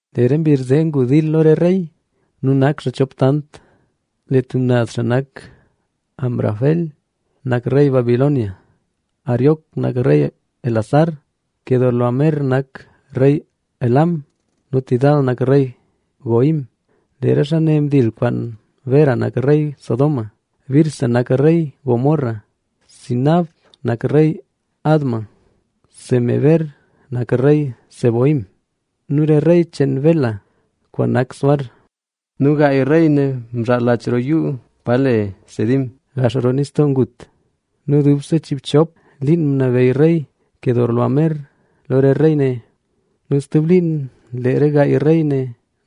Lee re mbizh zee ngu dil lo re rey nu nak xaa chop tant. Lee tub naz xaa nak: Amrafel nak rey Sinar, Arioc nak rey Elasar, Quedorlaomer nak rey Elam nu Tidal nak rey Goim. Lee re xaa ne mdil kwaan: Bera nak rey Sodoma Birsa nak rey Gomorra, Sinab nak rey Adma, Semeber nak rey Zeboim nu rey cheen Bela kwaan nak Zoar. Nu gaay rey ne mzhaal laach roo yuu pa le Sidim, gax roo Nistoo Ngut. Nu dubse chiibchop liin nabeyy rey Quedorlaomer lo re rey ne nu stub liin lee re gaay rey ne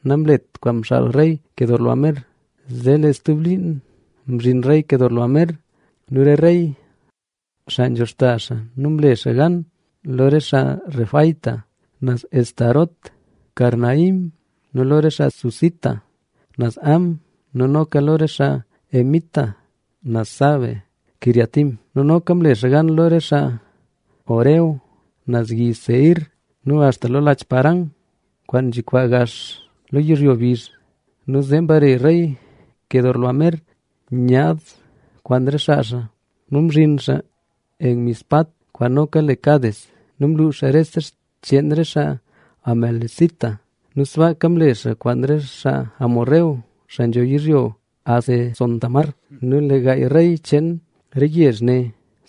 namlet kwaan mxaal rey Quedorlaomer. Zee lee stub liin mzhin rey Quedorlaomer nu re rey, xaa nzho xta xaa nu mle xaa gan lo re xaa Refaíta naz Astarot Karnaim nu lo re xaa Zuzita naz Ham nu noka lo re xaa Emita naz Save-quiriataim. Nu noka mle xaa gan lo re xaa Horeo naz yi Seir nu axta lo laach Parán, kwaan nzhikwaa gax lo yizhyo bizh. Nu zee mbare rey Quedorlaomer nyaad kwaan re xaa xaa nu mzhin xaa Enmispat, kwaan noka le Cades. Nu mluux xaa rese xcheen re xaa Amalecita nu sbaaka mle xaa kwaan re xaa Hesbón, xaa nzho yizhyo Hazezontamar. Nu lee gaay rey cheen re yezh ne: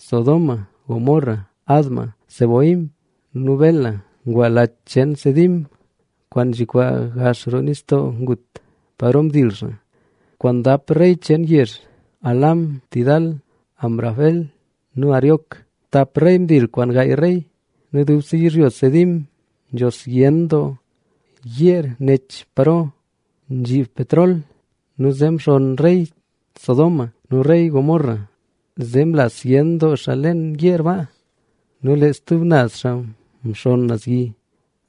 Sodoma, Gomorra, Adma, Zeboim nu Bela ngwa Laach cheen Sidim, kwaan nzhikwaa gax roo Nistoo Ngut, kwaan dap rey cheen yezh: Elam, Tidal, Amrafel nu Arioc. Tap rey mdil kwaan gaay rey. Nu dubse yizhyo Sidim nzho zyen doo yeer nech paro nzhib petrol nu; zee mxonn rey Sodoma nu rey Gomorra zee mla zyen xaa leen yeer ba nu lee stub naz xaa mxonn naz yi.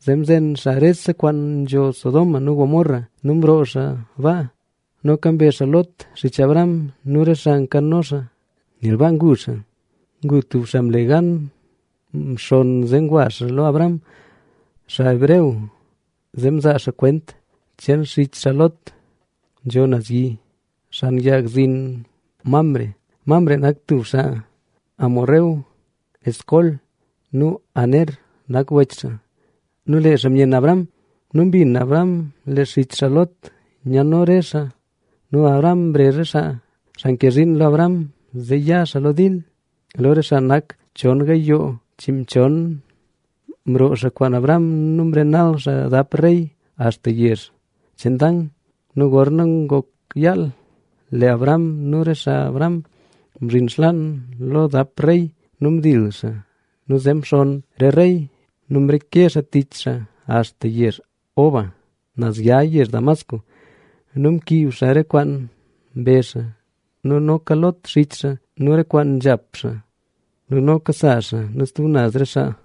Zee mzen xaa rese kwaan nzho Sodoma nu Gomorra nu mroo xaa baa. Noka mbe xaa Lot, xich Abram nu re kwaan nkano xaa, nel baa ngu xaa. Ngu tub xaa mle gan mxonn zee ngwa xaa lo Abram, xaa hebreo, zee mzaa xaa kwent cheen xich xaa Lot. Nzho xaa naz yi, xan xkag zin Mamre. Mamre nak tub xaa Hesbón. Escol nu Aner nak wech xaa. Nu lee xaa myenn Abram. Nu mbin Abram lee xich xaa Lot nyano re xaa. Nu Abram mrezh re xaa, xaa nke zhiin lo Abram, zee ya xaa lo dil. Lo re xaa nak xaa chon gayoo chiinmchon. Mroo xaa kwaan Abram nu mrenal xaa dap rey axta yezh cheen Dan. Nu gorna ngok yaal, lee Abram nu re xaa Abram mzhin xlaan lo dap rey nu mdil xaa nu zee mxonn re rey nu mreke xaa tich xaa axta yezh Hoba, naz ya yezh Damasco. Nu mkiib xaa re kwaan mbe xaa nu noka Lot, xich xaa nu re kwaan nzhap xaa nu noka sa xaa nu stub naz re xaa.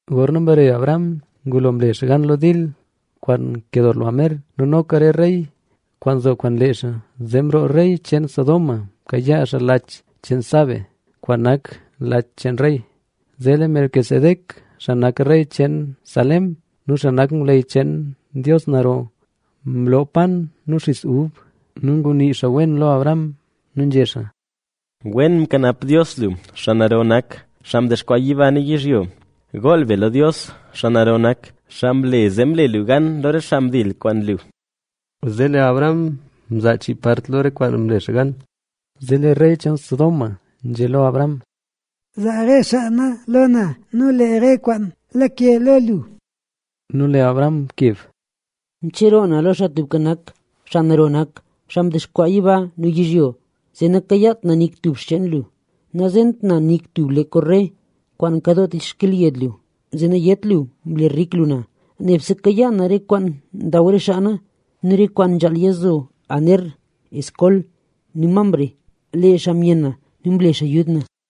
Gorna mbare Abram, ngulo mle xaa gan lo dil kwaan Quedorlaomer nu noka re rey kwaan nzo kwaan lee xaa, zee mroo rey cheen Sodoma mkayaa xaa lo laach cheen Save, kwaan nak Laach cheen Rey. Zee lee Melquisedec, xaa nak rey cheen Salem nu xaa nak ngwleyy cheen Dios Naro mloo yat nu xis ub. Nu ngunii xaa wen lo Abram nu nzhé xaa: Wen mkanap Dios lu, xaa Naro nak, xaa mdexkwaa yiba nu yizhyo, Gool be lo Dios, xaa Naro nak, xaa mle zee mle lu gan lo re xaa mdil kwaan lu. Zee lee Abram mzaa chii part lo re kwaan mle xaa gan. Zee lee rey cheen Sodoma nzhé lo Abram. —Zaa re xaa na lo na nu lee re kwaan lake lo lu. Nu lee Abram mkeb: —Mcheroo na lo Xaa Tubka Nak, Xaa Naro nak, xaa mdexkwaa yiba nu yizhyo, zee nakayaat na nik tub xcheen lu. Nazent na nik tub le korre kwaan nkadoo tich xkelyed lu, zee nayét lu mle rik lu na. Nebse kayaa na re kwaan ndaw re xaa na nu re kwaan nzhaal yazo Aner, Escol nu Mamre, lee xaa myenn na nu mle xaa yud na.